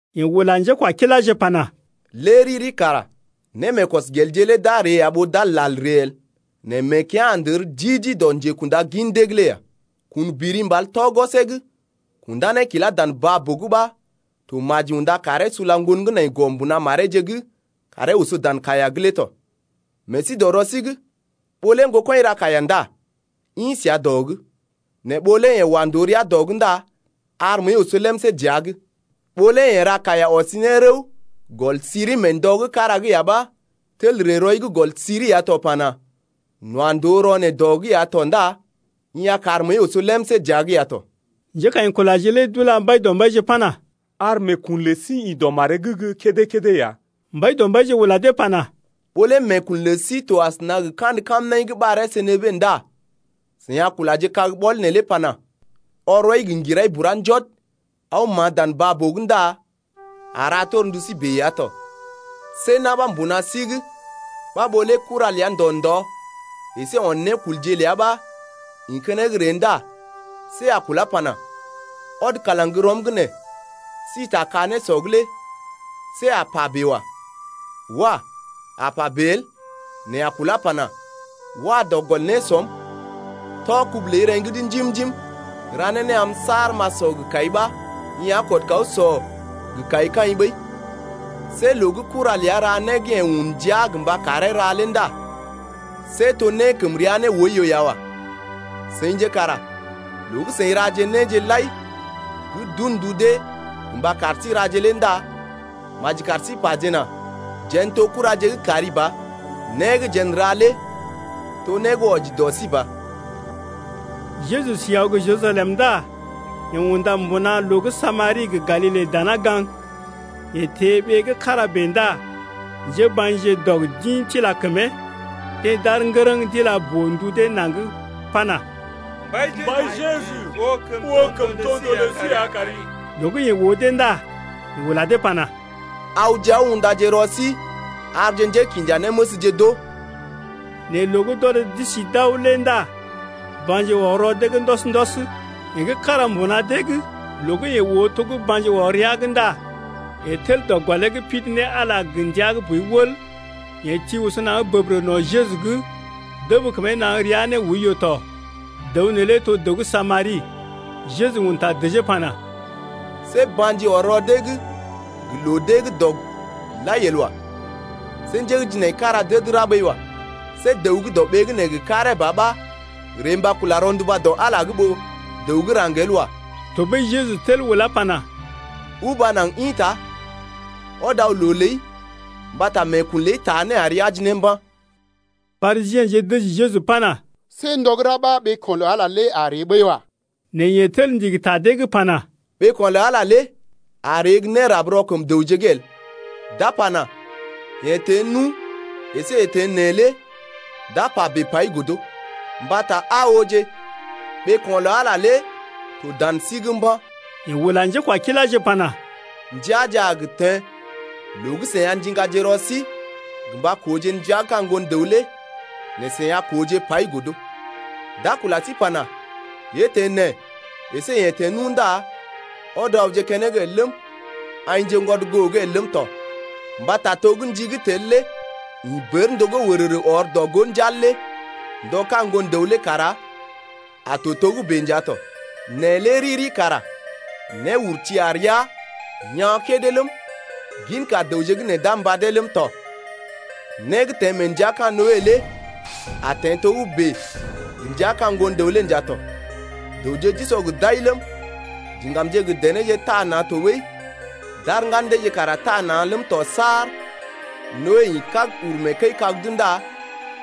Yeḛ ula njékwakiláje pana: Lé riri kara némeekɔsgelje lé d’a ree ya ɓó d’a lal ree el, nɛ meekea̰ a ndər di-di dɔ njékṵda gin dee’g lé ya! Kun biri mbal tɔ gwɔsee’g kundá ne kilá dan baa-boo’g ɓa to maji unda karee sula ŋgon gə́ nai gɔ mbuna mareeje’g karee oso dan kaiya’g lé tɔ. Meḛ sí dɔ rɔ sí’g. Ɓó lé ŋgokɔḭ ra kaiya ndá ḭ səa dɔ’g, nɛ ɓó lé yeḛ wa ndòo rəa dɔ’g ndá ar məəi oso lemsé dəa’g. Ɓó lé yeḛ ra kaiya ɔsi ne gel gɔl siri mee ndɔ gə́ kára’g ya ɓa tel ree rɔi’g gɔl siri ya to pana: N’wa ndòo rɔ neḛ dɔ’g ya tɔ ndá i a kar məəi oso lemsé dəa’g ya tɔ. Njékaḭkulaje lé d’ula Mbaidɔmbaije pana: Ar meekun lə sí ḭ dɔ maree’g gə́ kédé-kédé ya. Mbaidɔmbaije ula dee pana: Ɓó lé meekun lə sí to asəna gə kandə kamnaḭ gə́ ɓaree senebe ndá seḭ a kulaje kag-ɓɔl neelé pana: Ɔr rɔi gə ŋgirai bura njɔd aw ma̰a dan mán baa-boo’g ndá a ra torndu sí bèe ya tɔ. See na̰ ɓa mbuna sí’g ɓa ɓó lé kuraje ləa ndɔ ndɔ əsé on nékulje ləa ɓa ḭ keneŋ ree ndá see a kulá pana: Ɔd kalaŋ gə́ rɔm’g nee si ta ka-nésɔ’g lé see a pa bèe wa. Wah! a pa bèe el nɛ a kulá pana: Wa dɔ gɔl nésɔm, tɔ kubu ləi reŋgi’d njim-njim ra ne né am saar m’a sɔ gə kai ɓa i a kɔd kaw sɔ gə kai kaḭ ɓəi. See loo gə́ kura ləa ra né gə́ yeḛ un ndia gə mba karee ra lé ndá see to né gə́ kəm rəa ne oiyo ya wa. Seḭje kara loo gə́ seḭ raje néje lai gə́ d’un ndu dee gə mba kar sí raje lé ndá maji kar sí pajena: Jeḛ n’to kuraje gə́ kari ba, né gə́ jeḛ n’ra lé to né gə́ wɔji dɔ sí ɓa. Jeju si aw gə́ Jerusalem ndá yeḛ unda mbuna loo gə́ Samari gə Galile dana gaŋg. Yeḛ teḛ ɓee gə́ kára bèe ndá njéba̰je dɔg d’ḭ tila kəmee. Deḛ d’aar ŋgərəŋ d’ila boo-ndu dee naŋg pana: Mbai, Jeju, oo kəmtondoo lə sí ya kari! Loo gə́ yeḛ oo dee ndá yeḛ ula dee pana: Awje aw undaje rɔ sí arje njékinjanéməsje d’oo. Nɛ loo gə́ d’ɔd d’isi d’aw lé ndá ba̰ji ɔr rɔ dee’g ndɔs-ndɔs. Yeḛ gə́ kára mbuna dee’g loo gə́ yeḛ oo to gə́ ba̰ji ɔr rəa’g ndá yeḛ tel dɔ gɔlee’g pidi ne Ala gə ndia gə́ boi wəl. Yeḛ ti oso naŋg bəbərə no̰ Jeju’g dəb kəmee naŋg rəa ne oiyo tɔ. Dəw neelé to dəw gə́ Samari. Jeju un ta dəjee pana: See ba̰ji ɔr rɔ dee’g gə loo gə́ deḛ gə́ dɔg lai el wa. See njé gə́ jinaikara d’əd ra ɓəi wa. See dəw gə́ dɔɓee’g nee gə karee ba ɓa ree mba kula rɔnduba dɔ Ala’g ɓó dəw gə́ raŋg el wa. Tɔɓəi Jeju tel ulá pana: Uba naŋg ḭta ɔd aw loo ləi mbata meekun ləi taa né ari aji ne mba̰. Parisiḛje dəji Jeju pana: See ndɔ gə́ ra ɓa ɓeeko̰ lə Ala lé a ree ɓəi wa. Nɛ yeḛ tel ndigi ta dee’g pana: Ɓeeko̰ lə Ala lé a ree gə́ nérab rɔ kəm dəwje’g el. D’a pana: Yee teḛ nu əsé yee teḛ nee lé d’a pa bèe pai godo. Mbata aa ooje, ɓeeko̰ lə Ala lé to dan sí’g mba̰. Yeḛ ula njékwakiláje pana: Ndəaje a gə teḛ loo gə́ seḭ a ndiŋgaje rɔ sí gə mba kooje ndəa gə́ ka̰ Ŋgon-dəw lé nɛ seḭ a kooje pai godo. D’a kula sí pana: Yee teḛ nee əsé yeḛ teḛ nu ndá ɔd awje keneŋ el ləm, aḭjḛgwɔd goo’g el ləm tɔ. Mbata to gə́ ndi gə́ tel lé ḭ bər ndogó wərərə ɔr ne dɔ-gó njal lé ndɔ ka̰ Ŋgon-dəw lé kara a to togə́bè nja tɔ. Nɛ lé riri kara néurti a rəa yaa̰ kédé ləm, ginka dəwje gə́ nee d’a mbadee ləm tɔ. Né gə́ teḛ mee ndəa gə́ ka̰ Noe lé a teḛ togə́bè ndəa gə́ ka̰ Ŋgon-dəw’g lé nja tɔ. Dəwje d’usɔ gə d’ai ləm, diŋgam gə denéje taa na̰ tɔɓəi d’ar ŋgan deeje kara taa na̰ ləm tɔ saar Noe ḭ kág uru mee kəi-kag’d ndá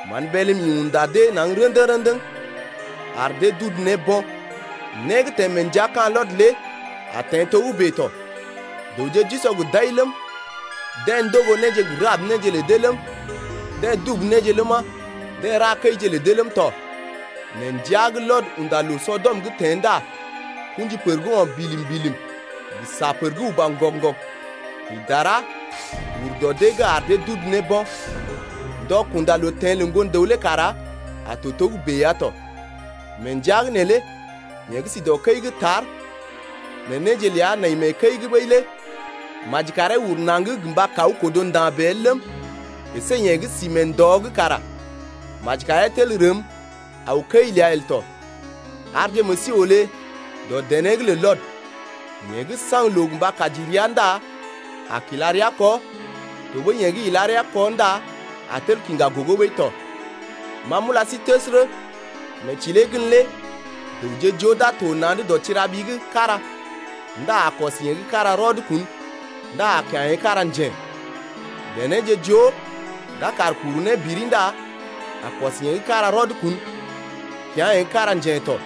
mán bélm ḭ unda dee ne naŋg rə̰dəŋ-rə̰dəŋ ar dee d’udu ne bo̰. Né gə́ teḛ mee ndəa gə́ ka̰ Lɔt lé a teḛ togə́bè tɔ. Dəwje d’usɔ gə d’ai ləm, deḛ ndogo néje gə rab néje lə dee ləm, deḛ dubu néje ləma, deḛ ra kəije lə dee ləm tɔ. Nɛ ndəa gə́ Lɔt unda loo Sɔdɔm’g teḛ ndá kṵji pər gə́ o̰ bilim-bilim, gə sa pər gə́ uba ŋgɔg-ŋgɔg ḭ dara ur dɔ dee’g ar dee d’udu ne bo̰. Ndɔ kunda loo teḛ lə Ŋgon-dəw lé kara a to togə́bè ya tɔ. Mee ndəa’g neelé yeḛ gə́ si dɔ kəi’g tar nɛ néje ləa nai kəi’g ɓəi lé maji karee uru naŋg gə mba kaw kodo nda̰ bèe el ləm, əsé yeḛ gə́ sí mee ndɔ’g kara maji karee tel rəm kaw kəi ləa el tɔ. Arje meḛ sí olé dɔ dené’g lə Lɔt. Yeḛ gə́ a saŋg loo mba kaji rəa ndá a kila rəa kɔ tɔɓəi yeḛ gə́ ila rəa kɔ ndá a tel kiŋga gogo ɓəi tɔ. Ma m’ula sí təsərə, mee tilee gən lé dəwje joo d’a to na̰’d dɔ tira-ɓi’g kára ndá a kɔs yeḛ gə́ kára rɔd kun ndá a kya̰ yeḛ gə́ kára njḛ. Denéje joo d’a kaar kuru ne biri ndá a kɔs yeḛ gə́ kára rɔd kun kya̰ yeḛ gə́ kára jen tɔ.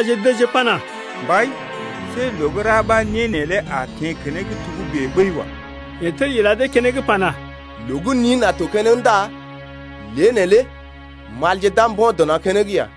Njékwakiláje dəjee pana: Mbai, see loo gə́ ra ɓa né neelé a teḛ keneŋ togə́bè ɓəi wa. Yeḛ tel ila dee keneŋ pana: Loo gə́ nin a to keneŋ ndá lée neelé malje d’a mbo̰ dɔ mbo̰ keneŋ ya.